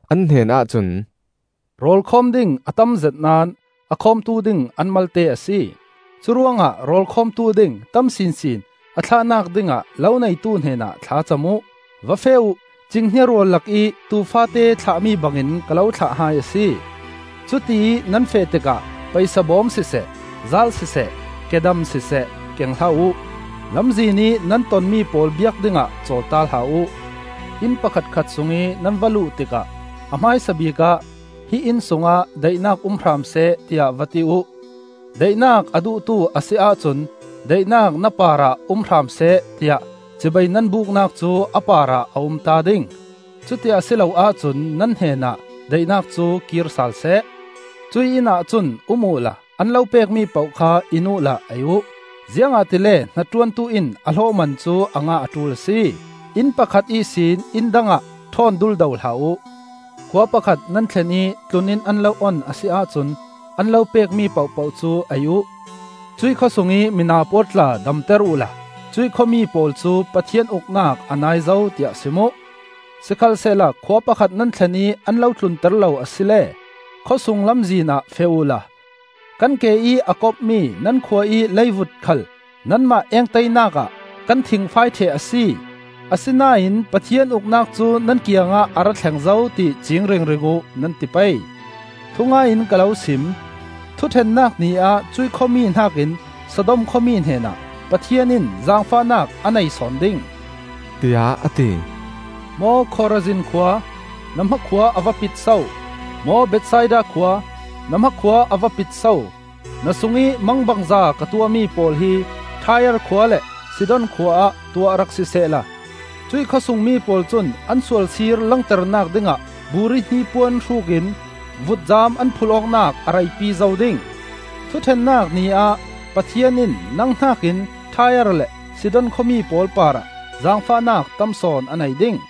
An hnenah cun, “Rawl khawm ding a tamzet naón a khawmtu ding an malte a si. Curuangah rawl khawmtu ding tam sinsin a thlahnak dingah lo neitu hnenah thla cam uh. Va feh uh! Cinghnia rual lakih tuu faate thlahmi bangin ka lo thlah hai a si. Cutiih nan feh tikah paisa bawm siseh, zaal siseh, kedam siseh keng hlah uh; lamzin ih nan tonmi pawl biak dingah cawlta hlah uh. Inn pakhatkhat sungih nan va luh tikah a hmaisabik ah, ‘Hi inn sungah daihnak um hram seh,’ tiah va ti uh. Daihnak a duhtu a si ahcun daihnak na parah um hram seh, tiah cibai nan buknak cu a parah a umta ding; cuti a si lo ahcun nan hnenah daihnak cu kir salseh. Cuih innah cun um uhla an lo pekmi poh kha in uhla ei uh; ziangahtile hnaṭuantu in a hlawhman cu a ngah a ṭul a si. Inn pakhat ihsin inn dangah ṭhawn duldo hlah uh. Khua pakhat nan thlen ih tlun-inn an lo on a si ahcun an lo pekmi pohpoh cu ei uh; cuih khawsungih mina pawl tla damter uhla cuih khuami pawl cu, ‘Pathian Uknak a nai zo,’ tiah sim uh. Sikhalsehla khua pakhat nan thlen ih an lo tlunter lo asile khawsung lamzin ah feh uhla, ‘Kan ke ih a kopmi nan khua ih leivut khal nanmah engtainak ah kan thingfai ṭheh a si. Asinain Pathian Uknak cu nan kiangah a ra thleng zo, ti ciing ringring uh,’ nan ti pei. Thungai in ka lo sim: Thuṭhennak Ni ah cuih khuami hnakin Sodom khuami hnenah Pathian in zaangfahnak a nei sawn ding,” tiah a ti. “Maw Khorazin khua, na hmakhua a va pit so! Maw Bethsaida khua, na hmakhua a va pit so! Na sungih mangbangza ka tuahmi pawl hi Tai-ar khua le Sidon khua ah tuah rak sisehla, cuih khawsungmi pawl cun an sualsir langternak dingah buri hnipuan hrukin vutcam an phulh awknak a reipi zo ding! Thuṭhennak Ni ah Pathian in nang hnakin Tai-ar le Sidon khuami pawl parah zaangfahnak tam sawn a nei ding.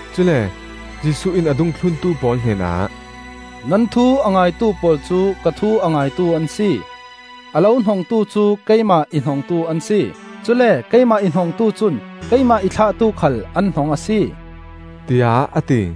Cule Jesuh in a dungthluntu pawl hnenah, “Nan thu a ngaitu pawl cu ka thu a ngaitu an si. A lo hnongtu cu keimah i hnongtu an si. Cule keimah i hnongtu cun keimah i thlahtu khal an hnong a si,” tiah a ti.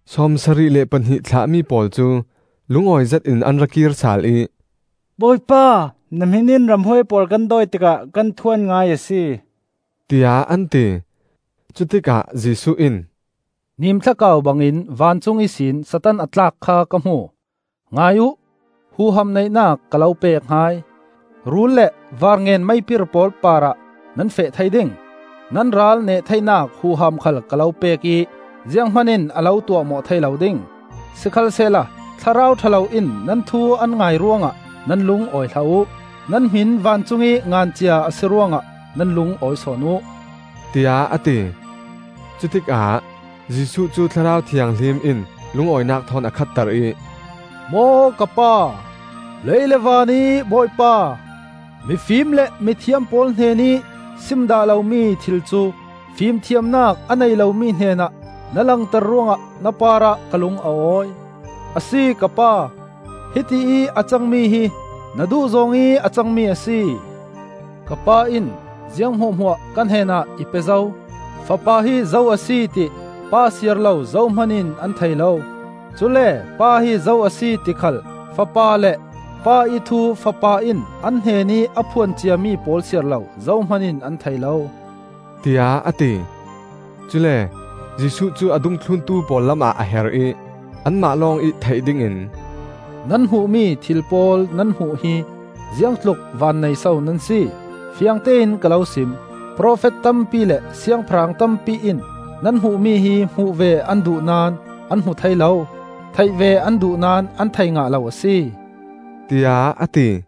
Sawmsarih le pahnih thlahmi pawl cu lungawi zetin an ra kir sal ih, “Bawipa, na hmin in ramhuai pawl kan dawi tikah kan thu an ngai a si,” tiah an ti. Cutikah Jesuh in, “Nimthlakau bangin vancung ihsin Satan a tlak kha ka hmu. Ngai uh! Huham neihnak ka lo pek hai: rul le varngen-meipir pawl parah nan feh thei ding; nan ral neh theinak huham khal ka lo pek ih zianghman in a lo tuahmawh thei lo ding. Sikhalsehla thlarau ṭha lo in nan thu an ngai ruangah nan lungawi hlah uh; nan hmin vancungih ngan cia a si ruangah nan lungawi sawn uh,” tiah a ti. Cutikah Jesuh cu Thlarau Thianghlim in lungawinak thawn a khatter ih, “Maw ka Pa, lei le vanih Bawipa, mifim le mithiam pawl hnenih sim dah lomi thil cu fimthiamnak a nei lomi hnenah na langter ruangah na parah ka lung a awi. A si ka Pa, hiti ih a cangmi hi na duhzawng ih a cangmi a si. “Ka Pa in ziang hmuahhmuah ka hnenah i pe zo. Fapa hi zo a si ti Pa siar lo zohman in an thei lo; cule Pa hi zo a si ti khal Fapa le, Pa ih thu Fapa in an hnenih a phuan ciami pawl siar lo zohman in an thei lo,” tiah a ti. Cule Jesuh cu a dungthluntu pawl lamah a her ih anmah lawngih theih dingin, “Nan hmuhmi thil pawl nan hmuh hi ziangtluk vannei so nan si! Fiangtein ka lo sim: profet tampi le siangpahrang tampi in nan hmuhmi hi hmuh ve an duh naón an hmu thei lo; theih ve an duh naón an thei ngah lo a si,” tiah a ti.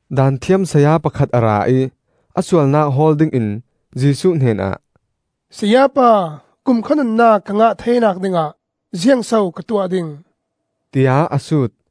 Daanthiam saya pakhat a ra ih a sualnak hawl dingin Jesuh hnenah, “Sayapa, kumkhua nunnak ka ngah theinak dingah ziangso ka tuah ding?” tiah a sut.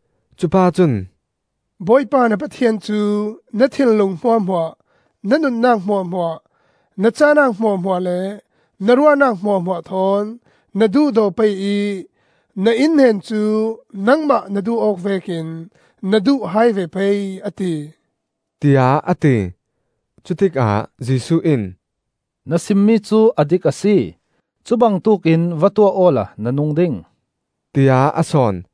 Cupa cun, “Bawipa na Pathian cu na thinlung hmuahhmuah, na nunnak hmuahhmuah, na cahnak hmuahhmuah le na ruahnak hmuahhmuah thawn na duhdaw pei ih na innhnen cu nangmah na duh awk vekin na duh hai ve pei, a ti,” tiah a ti. Cutikah Jesuh in, “Na simmi cu a dik a si; cu bangtuk in va tuah awla na nung ding,” tiah a sawn.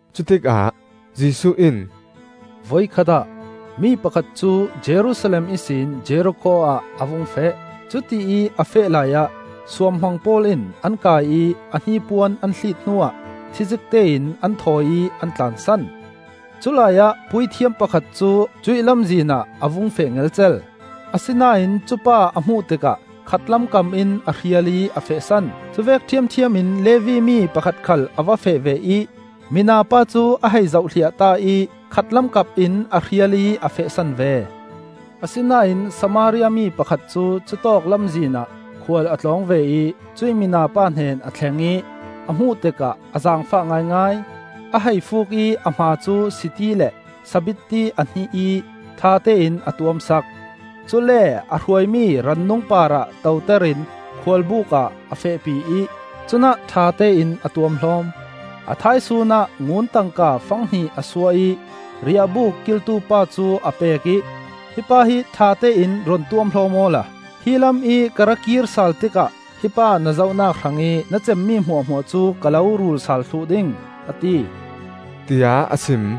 Cutikah Jesuh in, “Voikhat ah mi pakhat cu Jerusalem ihsin Jerikho ah a vung feh. Cutiih a feh laiah suamhmang pawl in an kai ih a hnipuan an hliit hnuah thizikte in an thawi ih an tlansan. Culai ah puithiam pakhat cu cuih lamzin ah a vung feh ngelcel; asinain cupa a hmuh tikah khatlam kam in a hrial ih a fehsan. Cuvek ṭhiamṭhiam in Levi mi pakhat khal a va feh ve ih mina pa cu a hei zohhliahta ih khatlam kapin a hrial ih a fehsan ve. Asinain Samaria mi pakhat cu cutawk lamzin ah khual a tlawng ve ih cuih mina pa hnen a thleng ih a hmuh tikah a zaangfah ngaingai. A hei fuuk ih a hma cu siti le sabitti a hnih ih ṭhatein a tuam sak. Cule a hruaimi rannung parah toter in khualbuk ah a fehpi ih cunah ṭhatein a tuamhlawm. A thaisun ah ngun tangka fanghnih a suah ih riahbuk kiltupa cu a pek ih, ‘Hi pa hi ṭhatein run tuamhlawm awla hi lam ih ka ra kir sal tikah hi pa na zohnak hrangih na cemmi hmuahhmuah cu ka lo ruul sal thluh ding,’ a ti,” tiah a sim.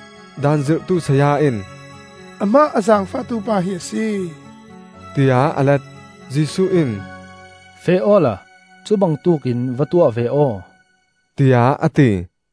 Daan zirhtu saya in, “Amah a zaangfahtu pa hi a si,” tiah a let. Jesuh in, “Feh awla cubangtuk in va tuah ve aw,” tiah a ti.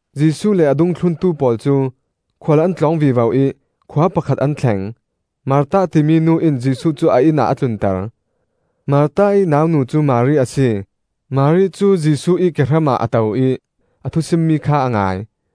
Jesuh le a dungthluntu pawl cu khual an tlawng vivo ih khua pakhat an thleng. Martha timi nu in Jesuh cu a inn ah a tlunter. Martha ih naunu cu Mari a si. Mari cu Jesuh ih kehram ah a to ih a thusimmi kha a ngai.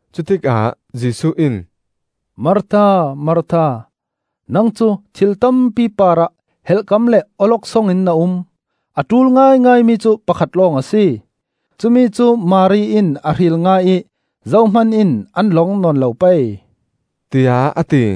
Cutikah Jesuh in, “Martha, Martha! Nang cu thil tampi parah helhkam le awloksong in na um; a ṭul ngaingaimi cu pakhat lawng a si. Cumi cu Mari in a hril ngah ih zohman in an lawng nawn lo pei,” tiah a ti.